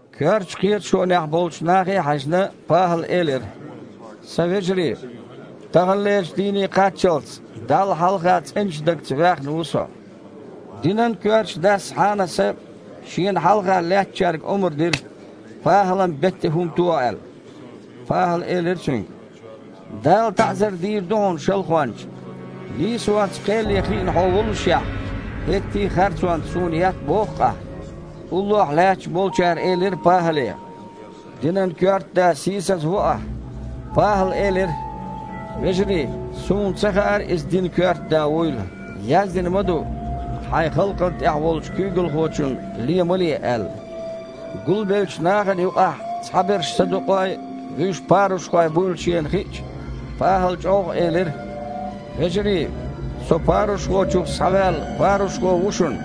Коьртачу кхеташонехь болчу нахе а хьаьжна, ПахІала элира: «Сан вежарий! Таханлерчу дийне кхаччалц Далла хьалха цІеначу дагца ваьхна ву со». Динан коьртачу дас Хьанаса шена хьалха лаьттачаьрга омра дира, ПахІалан бета тІе хІума тоха аьлла. ПахІала элира цуьнга: «Дала таІзар дийр ду хьуна, шалхонча. Нийсонца кхел ян хиъна хьо воллушехь, хІетте а харцонца суна етта боху-кх ахь». Уллохь лаьтташ болчара элира ПахІале: «Динан коьрта да сийсазво ахьа!» ПахІала элира: «Вежарий, суна ца хаьара иза динан коьрта да вуйла. Яздина ма ду: „Хьайн халкъана тІехь волчу куьйгалхочунна лен ма ле“, – аьлла». Гулбеллачу нахана юкъахь цхьаберш садукъой, вуьш парушхой буйла шена хиъча, ПахІала чІоггІа элира: «Вежарий! Со парушхочух схьаваьлла парушхо ву шуна!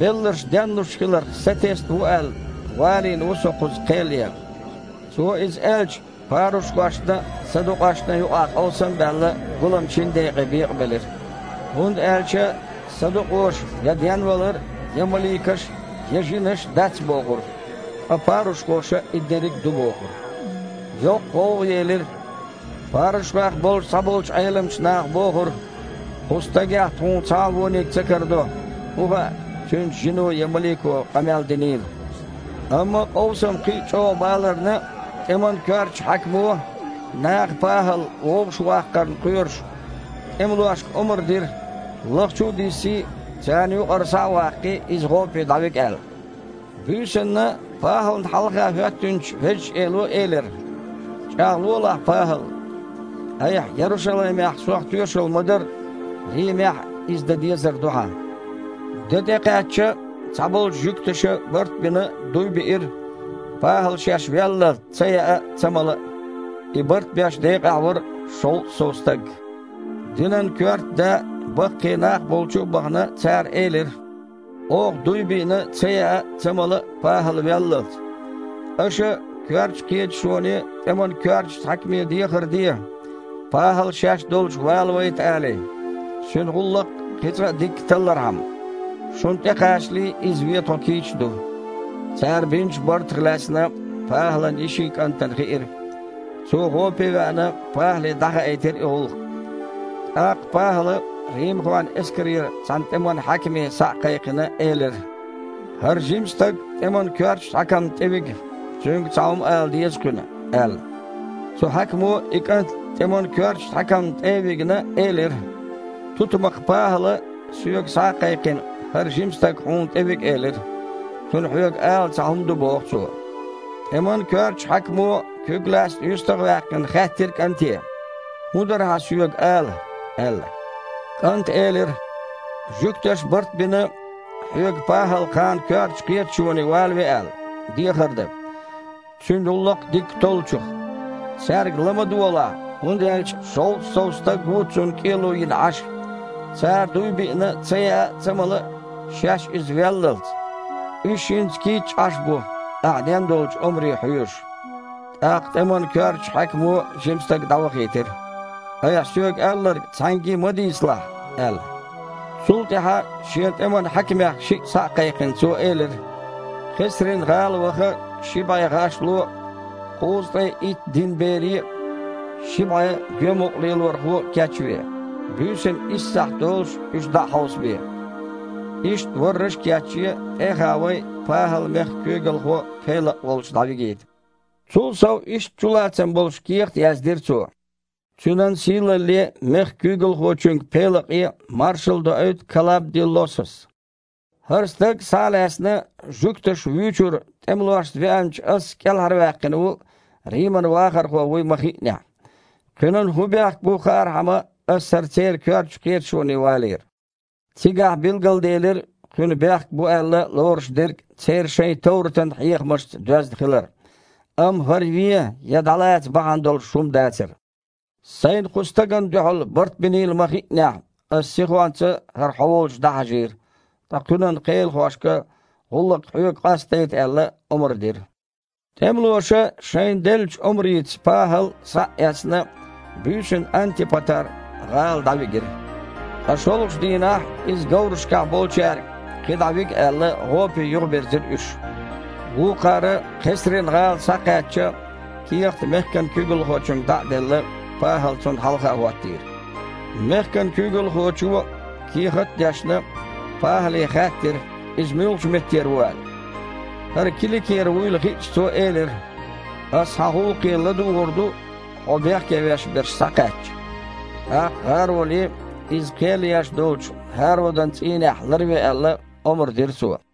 Белларш денлуш хиларх сатесна ву аьлла, валийна ву со кхуза кхел ян». Цо иза аьлча, парушхошна а, садукъошна а юкъахь къовсам а баьлла, гулам шина декъе бекъабелира. (ХІунда аьлча садукъоша я денвалар а, я маликаш а, я жинаш а дац бохура, ткъа парушхоша и дерриг а ду бохура.) Йоккха гІовгІа елира. Парушхойх болчу цхьаболчу Іеламчу наха бохура: «Кху стагехь тхуна цхьа а вониг ца карадо. ХІун хаьа, цуьнца жино я малико къамел динийла». Амма къовсам кхин а чІогІа баларна тІеман коьртачу хьаькамо, наха ПахІал вовшахваккхарна кхоьруш, тІемалошка омра дира, лаха чу а диссий, царна юкъара схьа а ваккхий, иза гІопе дІавига аьлла. Буьйсанна ПахІална хьалха хІоьттинчу Везачу Эло элира: «ЧІагІлолахь, ПахІал. Айхьа Ярушалаймехь Сох тоьшалла ма-дарра, Римехь а иза дан дезар ду хьан». Де тІекхаьчча, цхьаболчу жуьгташа, барт а бина, дуй биира ПахІал шаьш веллалц ца яа а, ца мала а. И барт беш декъехь вара шовзткъа сов стаг. Динан коьрта да а, баккхий нах а болчу а бахана, цара элира: «Оха дуй биъна ца яа а, ца мала а ПахІал веллалц. Аша а, коьртачу кхеташоно а тІеман коьртачу хьаькаме дехар де, ПахІал шаьш долчу валавайта алий, цуьнан гІуллакх кхин цкъа а дикка таллархьама. Шуна тІекхачале, иза вен тхо кийчча ду». Цара бинчу бартах лаьцна ПахІалан йишин кІантана хиира. Цо, гІопе а веана, ПахІале дІахаийтира и гІуллакх. ТІаккха ПахІала, римхойн эскарера цхьана тІеман хьаькаме схьа а кхайкхина, элира: «ХІара жима стаг тІеман коьртачу хьаькамна тІевига, цуьнга цхьа хІума ала деза кхуьнан», – аьлла. Цу хьаькамо, и кІант тІеман коьртачу хьаькамна тІе а вигина, элира: «Тутмакха ПахІала, соьга схьа а кхайкхина, хІара жима стаг хьуна тІевига элира. Кхуьнан хьоьга ала цхьа хІума ду боху цо». ТІеман коьртачу хьаькамо, куьг лаьцна юьстаха а ваьккхина, хаьттира кІанте: «ХІун дара хьан соьга ала?» – аьлла. КІанта элира: «Жуьгташа барт бина, хьоьга ПахІал кхана коьртачу кхеташоне валаве аьлла, дехар дан, цуьнан гІуллакх дикка толлучуха. Цаьрга ла ма догІалахь, хІунда аьлча шовзткъа сов стаг ву цунна кІело йина Іаш. Цара дуй биъна ца яа а, ца мала а шаьш иза веллалц. Уьш хІинца кийчча Іаш бу, ахь ден долчу омре хьоьжуш». ТІаккха тІеман коьртачу хьаькамо жима стаг дІавахийтира: «Айхьа соьга аьлларг цхьаьнгге а ма дийцалахь», – аьлла. Цул тІаьхьа, шен тІеман хьаькамех шиъ схьа а кхайкхина, цо элира: «Кхесрин-гІала ваха ши бІе гІашло а, кхузткъе итт дин-бере а, ши бІе гоьмукълелорхо а кечве, буьйсанна исс сахьт долуш уьш дІа а хьовсабе. Иштта, варраш а кечъе, тІе а хаавай, ПахІал мехкан куьйгалхо Пелакъ волчу дІавигийта». Цул сов, иштта чулацам болуш кехат а яздира цо: «Цуьнан сийлалле мехкан куьйгалхочуьнга Пелакъе маршалла доуьйту Калабди Лосас. ХІара стаг, схьа а лаьцна, жуьгташа вуьйчуьра тІемалошца веанчу ас кІелхьарваьккхина ву, Риман вахархо вуй ма-хиъинехь. Кхуьнан хІун бехк бу хаархьама, ас хІара церан коьртачу кхеташоне валийра. Цигахь билгалделира кхуьнан бехк бу аьлла лоруш дерг церан шайн товратан хьехамашца доьзна хилар. Амма хІара вен я дІалаца бахьана долуш хІума дацара. Сайна кху стагана дуьхьал барт бинийла ма-хиъинехь, ас сихонца хІара хьо волчу дІахьажийра, ткъа кхуьнан кхелахошка, гІуллакх хьоьга къастадайта аьлла, омра дира». ТІемалоша шайна деллачу омрица ПахІал, схьа а эцна, буьйсанна Анти-Патар-гІала дІавигира. Ткъа шолгІачу дийнахь, иза говрашкахь болчаьрга кхидІа вига а аьлла, гІопе юхабирзира уьш. Вукхара, Кхесрин-гІала схьакхаьчча, кехат мехкан куьйгалхочуьнга дІа а делла, ПахІал цунна хьалха хІоттийра. Мехкан куьйгалхочо, кехат а дешна, ПахІале хаьттира, иза муьлхачу меттера ву аьлла. ХІара Киликера вуйла хиъча, цо элира: «Ас хьан гІуллакхе ладугІур ду, хьо бехке веш берш схьакхаьчча». ТІаккха гІароле, иза кхел еш долчу ХІародан цІийнехь ларве аьлла, омра дира цо.